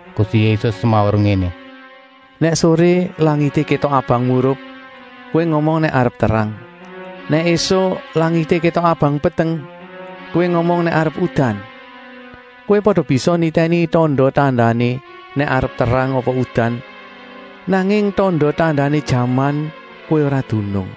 Gusti Yésus semaur ngéné: (“Nèk soré langité kétok abang murup, kowé ngomong nèk arep terang. Nèk ésuk langité kétok abang peteng, kowé ngomong nèk arep udan. Kowé pada bisa nitèni tanda-tandané nèk arep terang apa udan, nanging tanda-tandané jaman kowé ora dunung.)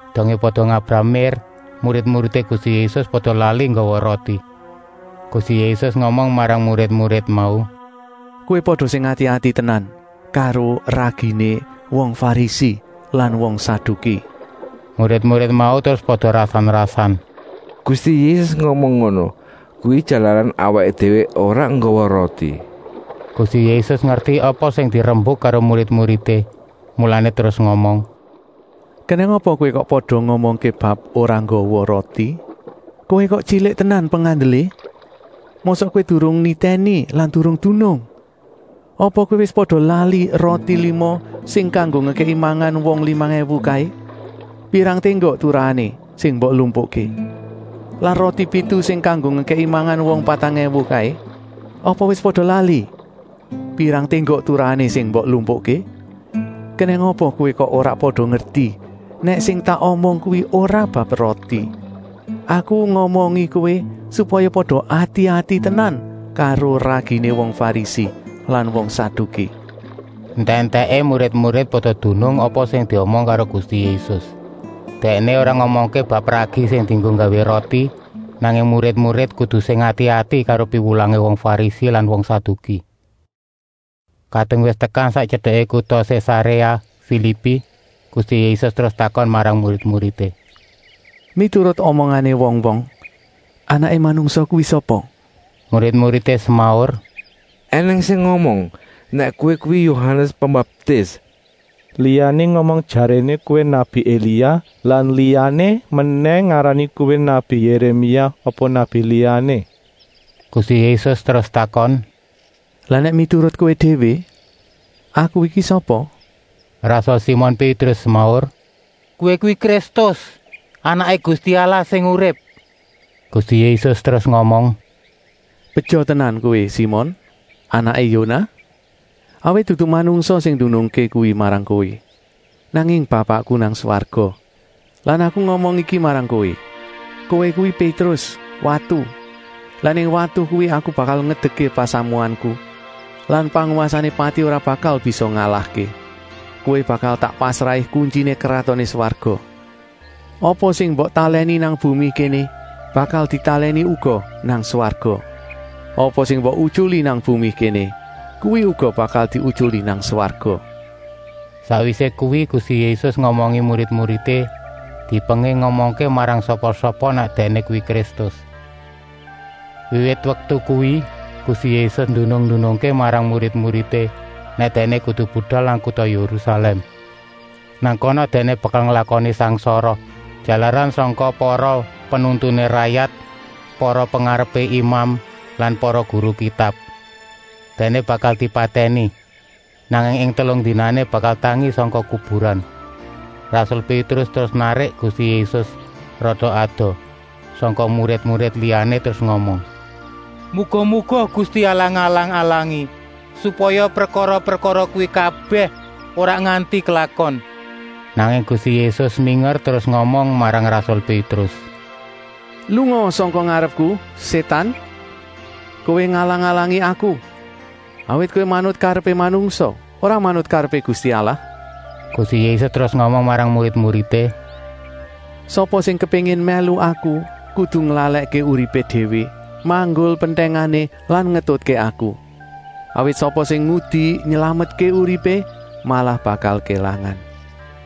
Dongé pada ngabrah mér, murid-muridé Gusti Yésus pada lali nggawa roti. Gusti Yésus ngomong marang murid-murid mau: “Kowé pada sing ati-ati tenan karo raginé wong Farisi lan wong Saduki.” Murid-murid mau terus pada rasan-rasan: “Gusti Yésus ngomong ngono kuwi jalaran awaké déwé ora nggawa roti.” Gusti Yésus ngerti apa sing dirembuk karo murid-muridé, mulané terus ngomong: “Kenèng apa kowé kok pada ngomongké bab ora nggawa roti? Kowé kok tyilik tenan pengandelé? Mosok kowé durung nitèni lan durung dunung? Apa kowé wis pada lali roti lima sing kanggo ngekèki mangan wong limang èwu kaé. Pirang ténggok turahané sing mbok lumpukké? Lan roti pitu sing kanggo ngekèki mangan wong patang èwu kaé? Apa wis pada lali? Pirang ténggok turahané sing mbok lumpukké? Kenèng apa kowé kok ora pada ngerti nèk sing tak omong kuwi ora bab roti? Aku ngomongi kowé supaya pada ati-ati tenan karo raginé wong Farisi lan wong Saduki.” Entèk-entèké murid-murid pada dunung apa sing diomong karo Gusti Yésus. Dèkné ora ngomongké bab ragi sing dienggo nggawé roti, nanging murid-murid kudu sing ati-ati karo piwulangé wong Farisi lan wong Saduki. Kadung wis tekan sak tyedeké kuta Sésaréa Filipi, Gusti Yésus terus takon marang murid-muridé: “Miturut omongané wong-wong, Anaké Manungsa kuwi sapa?” Murid-muridé semaur: “Enèng sing ngomong nèk Kowé kuwi Yohanes Pembaptis, liyané ngomong jaréné Kowé nabi Elia lan liyané menèh ngarani Kowé nabi Yéremia apa nabi liyané.” Gusti Yésus terus takon: “Lah nèk miturut kowé déwé, Aku iki sapa?” Rasul Simon Pétrus semaur: “Kowé kuwi Kristus, Anaké Gusti Allah sing urip!” Gusti Yésus terus ngomong: “Beja tenan kowé Simon, anaké Yonah, awit dudu manungsa sing ndunungké kuwi marang kowé, nanging Bapakku nang swarga. Lan Aku ngomong iki marang kowé: kowé kuwi Pétrus, watu lan ing watu kuwi Aku bakal ngedekké pasamuanku lan pangwasané pati ora bakal bisa ngalahké. Kowé bakal tak pasrahi kuntyiné Kratoné Swarga. Apa sing mbok talèni nang bumi kéné, bakal ditalèni uga nang swarga. Apa sing mbok utyuli nang bumi kéné, kuwi uga bakal diutyuli nang swarga.” Sakwisé kuwi Gusti Yésus ngomongi murid-muridé, dipenging ngomongké marang sapa-sapa nèk Dèkné kuwi Kristus. Wiwit waktu kuwi Gusti Yésus ndunung-ndunungké marang murid-muridé nèk Dèkné kudu budal nang kuta Yérusalèm. Nang kana Dèkné bakal nglakoni sangsara, jalaran sangka para penuntuné rayat, para pengarepé imam lan para guru Kitab. Dèkné bakal dipatèni, nanging ing telung dinané bakal tangi sangka kuburan. Rasul Pétrus terus narik Gusti Yésus rada adoh sangka murid-murid liyané terus ngomong: “Muga-muga Gusti Allah ngalang-alangi, supaya prekara-prekara kuwi kabèh ora nganti klakon.” Nanging Gusti Yésus minger terus ngomong marang rasul Pétrus: “Lungaa sangka ngarepku, Sétan! Kowé ngalang-alangi Aku, awit kowé manut karepé manungsa, ora manut karepé Gusti Allah.” Gusti Yésus terus ngomong marang murid-muridé: “Sapa sing kepéngin mèlu Aku kudu nglalèkké uripé déwé, manggul pentèngané lan ngetutké Aku. Awit sapa sing ngudi nylametké uripé, malah bakal kélangan.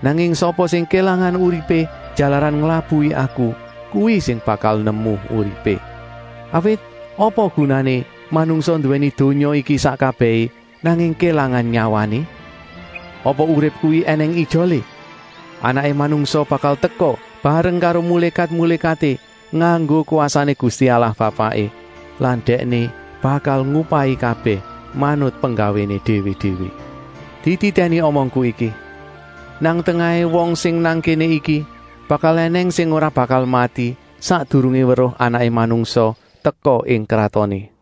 Nanging sapa sing kélangan uripé jalaran nglabuhi Aku, kuwi sing bakal nemu uripé. Awit apa gunané manungsa nduwèni donya iki sak kabèhé, nanging kélangan nyawané? Apa urip kuwi ènèng ijolé? Anaké Manungsa bakal teka bareng karo mulékat-mulékaté nganggo kwasané Gusti Allah Bapaké lan Dèkné bakal ngupahi kabèh manut penggawéné déwé-déwé. Dititèni omongku iki: nang tengahé wong sing nang kéné iki bakal ènèng sing ora bakal mati sakdurungé weruh Anaké Manungsa teka ing kratoné.”